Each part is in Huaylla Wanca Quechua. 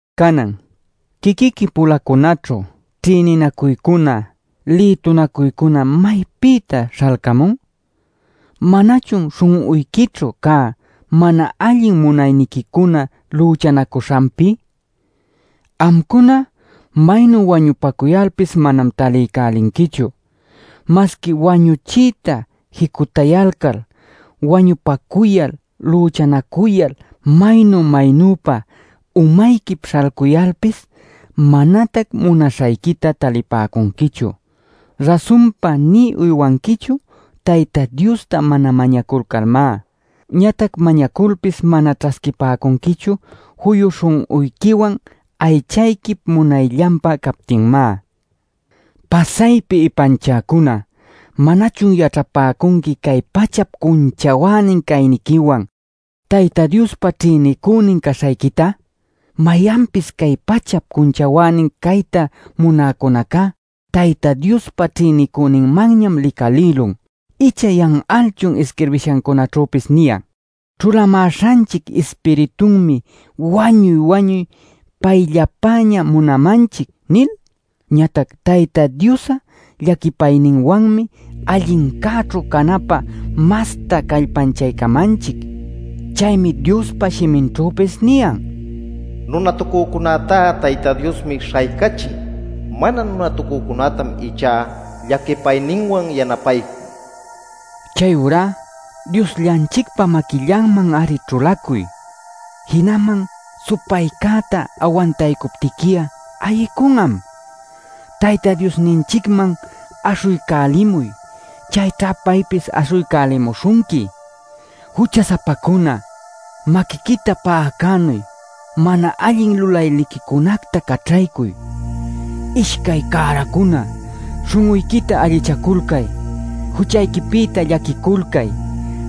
Canan ¿quiquiqui-pulacunaćhu ćhïninacuycuna lïtunacuycuna maypïtá śhalcamun? ¡¿Manachun śhun'uyquićhu cä mana allin munayniquicuna lüchanacuśhanpi?! Amcuna maynu wañupacuyalpis manam taliycälinquichu. Masqui wañuchiyta jicutayalcal, wañupacuyal, lüchanacuyal maynu-maynüpa umayquip śhalcuyalpis manatac munaśhayquita talipäcunquichu. Rasunpa nï uywanquichu Tayta Diosta mana mañaculcalmá. Ñatac mañaculpis mana ćhasquipäcunquichu juyu śhun'uyquiwan aychayquip munayllanpä captinmá. ¡Pasaypi ipanchäcuna! ¿Manachun yaćhapäcunqui cay pachap cunchawänin cayniquiwan Tayta Diospa ćhïnicünin caśhayquita? Mayanpis cay pachap cunchawänin cayta munäcunacá Tayta Diospa ćhïnicüninmanñam licalïlun. ¿Icha yan'alchun isquirbishancunaćhüpis niyan: “Ćhulamäśhanchic ispiritunmi wañuy-wañuy payllapäña munamanchic” nil? Ñatac Tayta Dios'a llaquipayninwanmi allincäćhu canapä masta callpanchaycamanchic. Chaymi Diospa shiminćhüpis niyan: “Nunatucücunätá Tayta Diosmi śhaycachin; mana nunatucücunätam ichá llaquipayninwan yanapaycun” nil. Chayurá Diosllanchicpa maquillanman-ari ćhulacuy. Jinaman supaycäta awantaycuptiqui'a ayicun'am. Tayta Diosninchicman aśhuycälimuy; chayćha paypis aśhuycälimuśhunqui. ¡Jucha-sapacuna, maquiquita pa'acänuy, mana allin lulayniquicunacta caćhaycuy! ¡Ishcay cäracuna, śhun'uyquita allichaculcay! ¡Juchayquipïta llaquiculcay,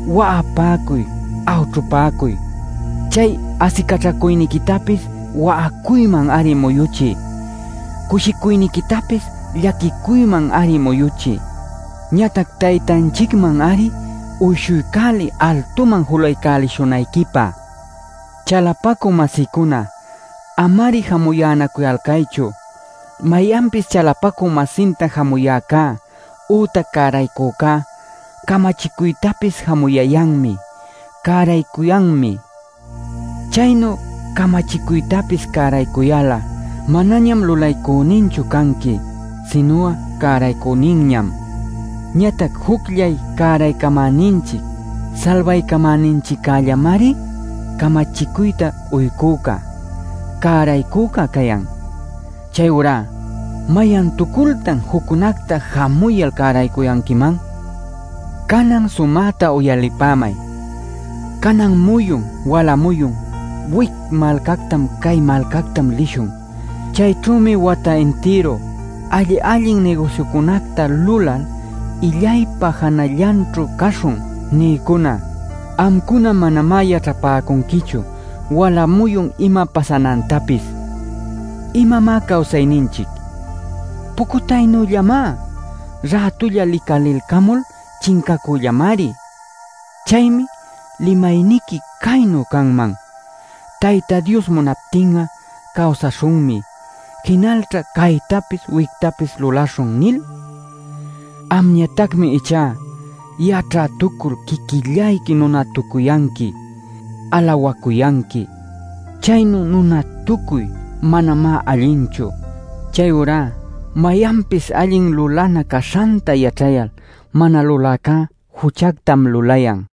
wa'apäcuy, awćhupäcuy! ¡Chay asicaćhacuyniquitapis wa'acuyman-ari muyuchiy; cushicuyniquitapis llaquicuyman-ari muyuchiy! Ñatac Taytanchicman-ari uyshuycäliy altuman julaycälishunayquipä. Chalapacü-masïcuna, ama-ari jamuyänacuyalcaychu. Mayanpis chalapacü-masinta jamuyäcá ütac cäraycücá camachicuytapis jamuyayanmi, cäraycuyanmi. Chaynu camachicuytapis cäraycuyal'a manañam lulaycüninchu canqui sinu'a cäraycüninñam. Ñatac jucllay cäraycamäninchic salbaycamäninchiccällamari camachicuyta uycüca, cäraycüca cayan. Chayurá ¿mayantucultan juccunacta jamuyal cäraycuyanquiman? Canan sumäta uyalipämay “Canan muyun wala muyun wic malcactam cay malcactam lishun; chayćhümi wata intiru alli-allin nigusyucunacta lulal illaypa janallanćhu caśhun” nïcuna. Amcuna manamá yaćhapäcunquichu wala muyun ima pasanantapis. ¿Imamá cawsayninchic? Pucutaynüllamá, rätulla licalilcamul chincacüllamari. Chaymi limayniqui caynu canman: “Tayta Dios munaptin'a cawsaśhunmi; jinalćha caytapis wictapis lulaśhun” nil. Amñatacmi ichá yaćhätucul quiquillayqui nunatucuyanqui, alawacuyanqui. Chaynu nunatucuy manamá allinchu. Chayurá mayanpis allin lulana caśhanta yaćhayal, mana luläcá juchactam lulayan.